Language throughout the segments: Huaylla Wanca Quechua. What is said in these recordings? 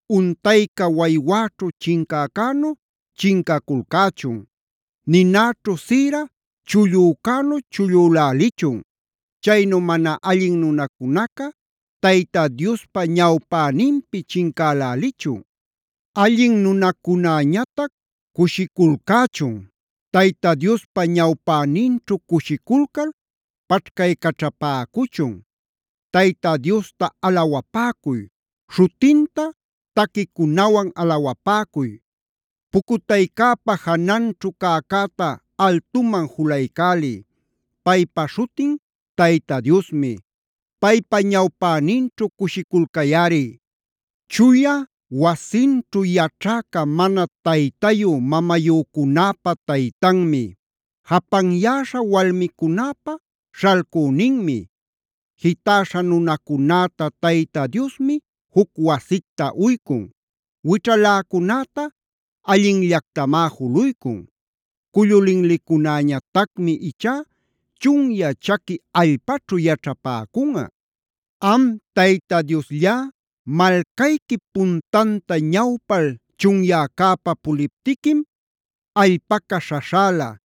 Untayca waywäćhu chincäcänu chincaculcächun. Ninäćhu sïra chullücänu chullülälichun. Chaynu mana allin nunacunaca Tayta Diospa ñawpäninpi chincälälichun. Allin nunacunäñatac cushiculcächun. Tayta Diospa ñawpäninćhu cushiculcal paćhcaycaćhapäcuchun. Tayta Diosta alawapäcuy; śhutinta taquicunawan alawapäcuy. Pucutaycäpa jananćhu cäcäta altuman julaycäliy. Paypa śhutin Tayta Diosmi. Paypa ñawpäninćhu cushiculcayꞌari. Chuya wasinćhu yaćhäca mana taytayu-mamayücunäpa taytanmi. Japanyäśha walmicunäpa śhalcüninmi. Jitäśha nunacunäta Tayta Diosmi juc wasicta uycun. Wićhaläcunäta allinllactamá juluycun. Cullu linlicunäñatacmi ichá chunyä chaqui allpaćhu yaćhapäcunꞌa. Am Tayta Diosllá, malcayquip puntanta ñawpal chunyäcäpa puliptiquim, allpaca śhaśhäla,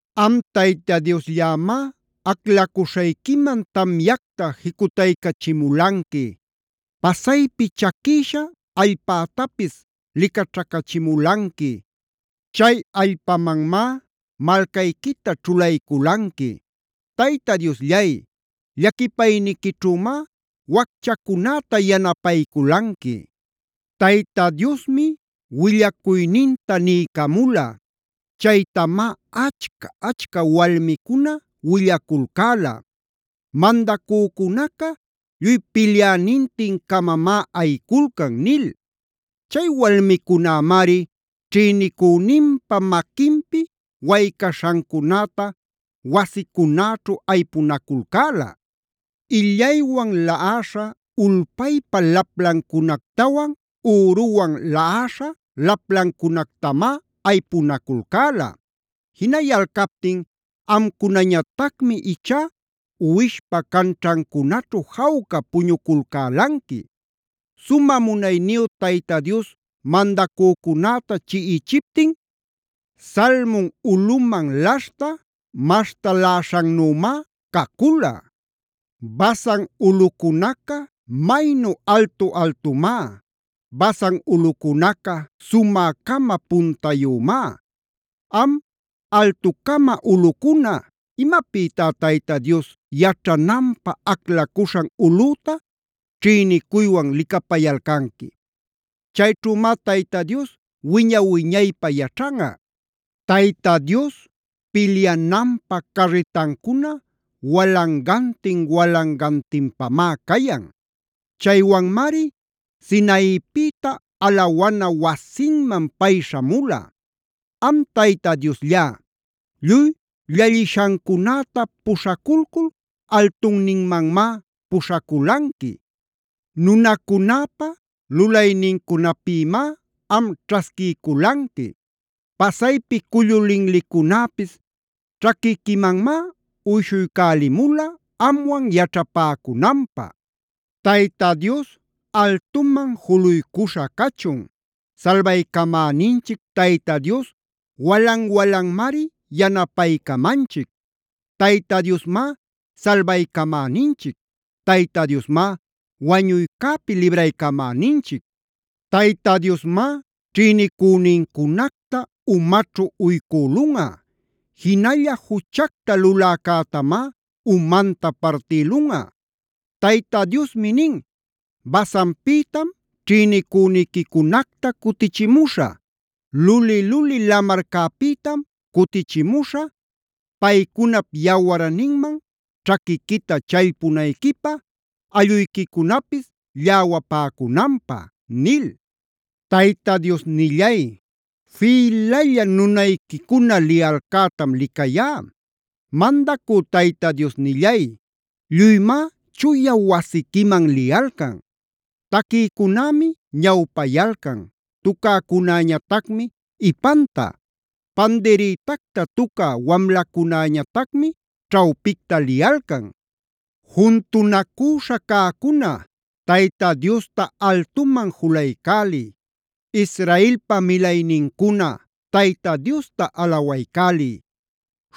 Am Tayta Diosllämi, aclacuśhayquiman tamyacta jicutaycachimulanqui. Pasaypi chaquïsha allpätapis licaćhacächimulanqui. Chay allpamanmá malcayquita ćhulayculanqui. Tayta Diosllay, llaquipayniquićhümá wacchacunäta yanapayculanqui. Tayta Diosmi willacuyninta niycamula. Chaytamá achca-achca walmicuna willaculcäla: “Mandacücunaca lluy pilyänintin-camamá ayiculcan” nil. Chay walmicunämari ćhïnicüninpa maquinpi waycaśhancunäta wasicunäćhu aypunaculcäla. Illaywan laꞌaśha ulpaypa laplancunactawan üruwan laꞌaśha laplancunactamá aypunaculcäla. Jinayalcaptin amcunañatacmi ichá uwishpa canćhancunaćhu jawca puñuculcälanqui. Sumä munayniyu Tayta Dios mandacücunäta chiꞌichiptin Salmon ulꞌuman laśhta maśhtaläśhannümá cacula. Basan ulꞌucunaca maynu altu-altumá. Basan ulꞌucunaca sumä-cama puntayümá. Am, altu-cama ulꞌucuna ¿imapïtá Tayta Dios yaćhananpä aclacuśhan ulꞌüta ćhïnicuywan licapayalcanqui? Chayćhümá Tayta Dios wiña-wiñaypä yaćhanꞌa. Tayta Dios pilyananpä carritancuna walangantin-walangantinpamá cayan. Chaywanmari Sinaipïta alawana wasinman pay śhamula. Am Tayta Diosllá, lluy llallishancunäta puśhaculcul altunninmanmá puśhaculanqui. Nunacunäpa lulaynincunapïmá am ćhasquiyculanqui.d Pasaypi cullu linlicunäpis ćhaquiquimanmá uyshuycälimula amwan yaćhapäcunanpä. Tayta Dios altuman juluycuśha cachun. Salbaycamäninchic Tayta Dios walan-walanmari yanapaycamanchic. Tayta Diosmá salbaycamäninchic. Tayta Diosmá wañuycäpi libraycamäninchic. Tayta Diosmá ćhïnicünincunacta umaćhu uycülunꞌa. Jinalla juchacta luläcätamá umanta partïlunꞌa. Tayta Diosmi nin: “Basanpïtam ćhïnicüniquicunacta cutichimuśhä. Luli-luli lamarcapïtam cutichimuśhä, paycunap yawarninman ćhaquiquita challpunayquipä, allꞌuyquicunapis lläwapäcunanpä” nil. Tayta Diosnillay, fïlalla nunayquicuna liyalcätam licayá. Mandacü Tayta Diosnillay, lluymá chuya wasiquiman liyalcan. Taquïcunämi ñawpayalcan, tucäcunäñatacmi ipanta, pandirïtacta tucä wamlacunäñatacmi ćhawpicta liyalcan. Juntunacüśha cäcuna Tayta Diosta altuman julaycäliy. Israelpa milaynincuna Tayta Diosta alawaycäliy.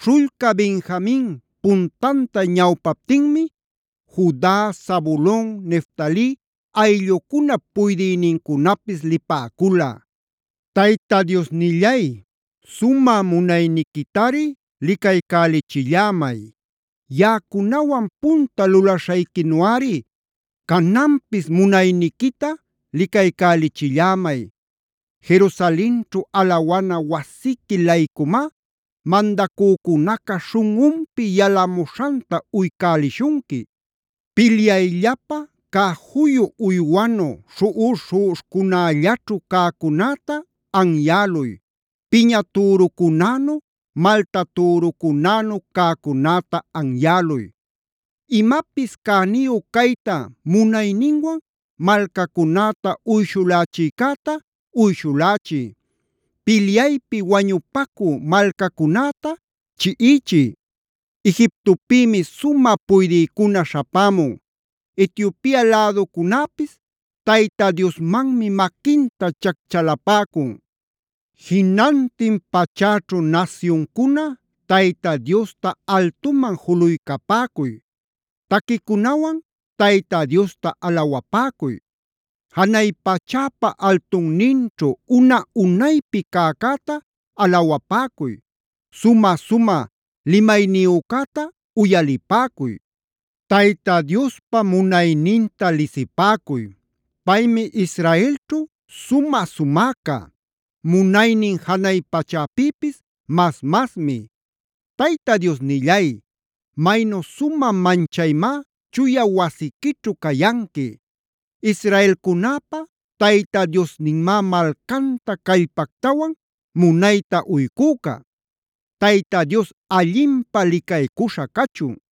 Śhullca Benjamin puntanta ñawpaptinmi Juda, Zabulon, Neftali ayllucunap puydïnincunapis lipäcula. Tayta Diosnillay, sumä munayniquitari licaycälichillämay. Yaꞌacunawan punta lulaśhayquinuꞌari cananpis munayniquita licaycälichillämay. Jerusalenćhu alawana wasiqui-laycumá mandacücunaca śhunꞌunpi yalamuśhanta uycälishunqui. Pilyayllapä cä juyu uywanu śhuꞌuśh-śhuꞌuśhcunällaćhu cäcunäta anyäluy, piña türucunänu, malta türucunänu cäcunäta anyäluy. Imapis cäniyu cayta munayninwan malcacunäta uyshulächïcäta uyshulächiy. Pilyaypi wañupacü malcacunäta chiꞌichiy. Egiptopïmi sumä puydïcuna śhapämun. Etiopia läducunäpis Tayta Diosmanmi maquinta chacchalapäcun. Jinantin pachäćhu nasyuncuna Tayta Diosta altuman juluycapäcuy. Taquicunawan Tayta Diosta alawapäcuy. Janay pachäpa altunninćhu una-unaypi cäcäta alawapäcuy. Sumä-sumä limayniyücäta uyalipäcuy. Tayta Diospa munayninta lisipäcuy. Paymi Israelćhu sumä-sumäca. Munaynin janay pachäpïpis mas-masmi. Tayta Diosnillay, maynu sumä manchaymá chuya wasiquićhu cayanqui. Israelcunäpa Tayta Diosninmá malcanta callpactawan munayta uycüca. ¡Tayta Dios allinpä licaycuśha cachun!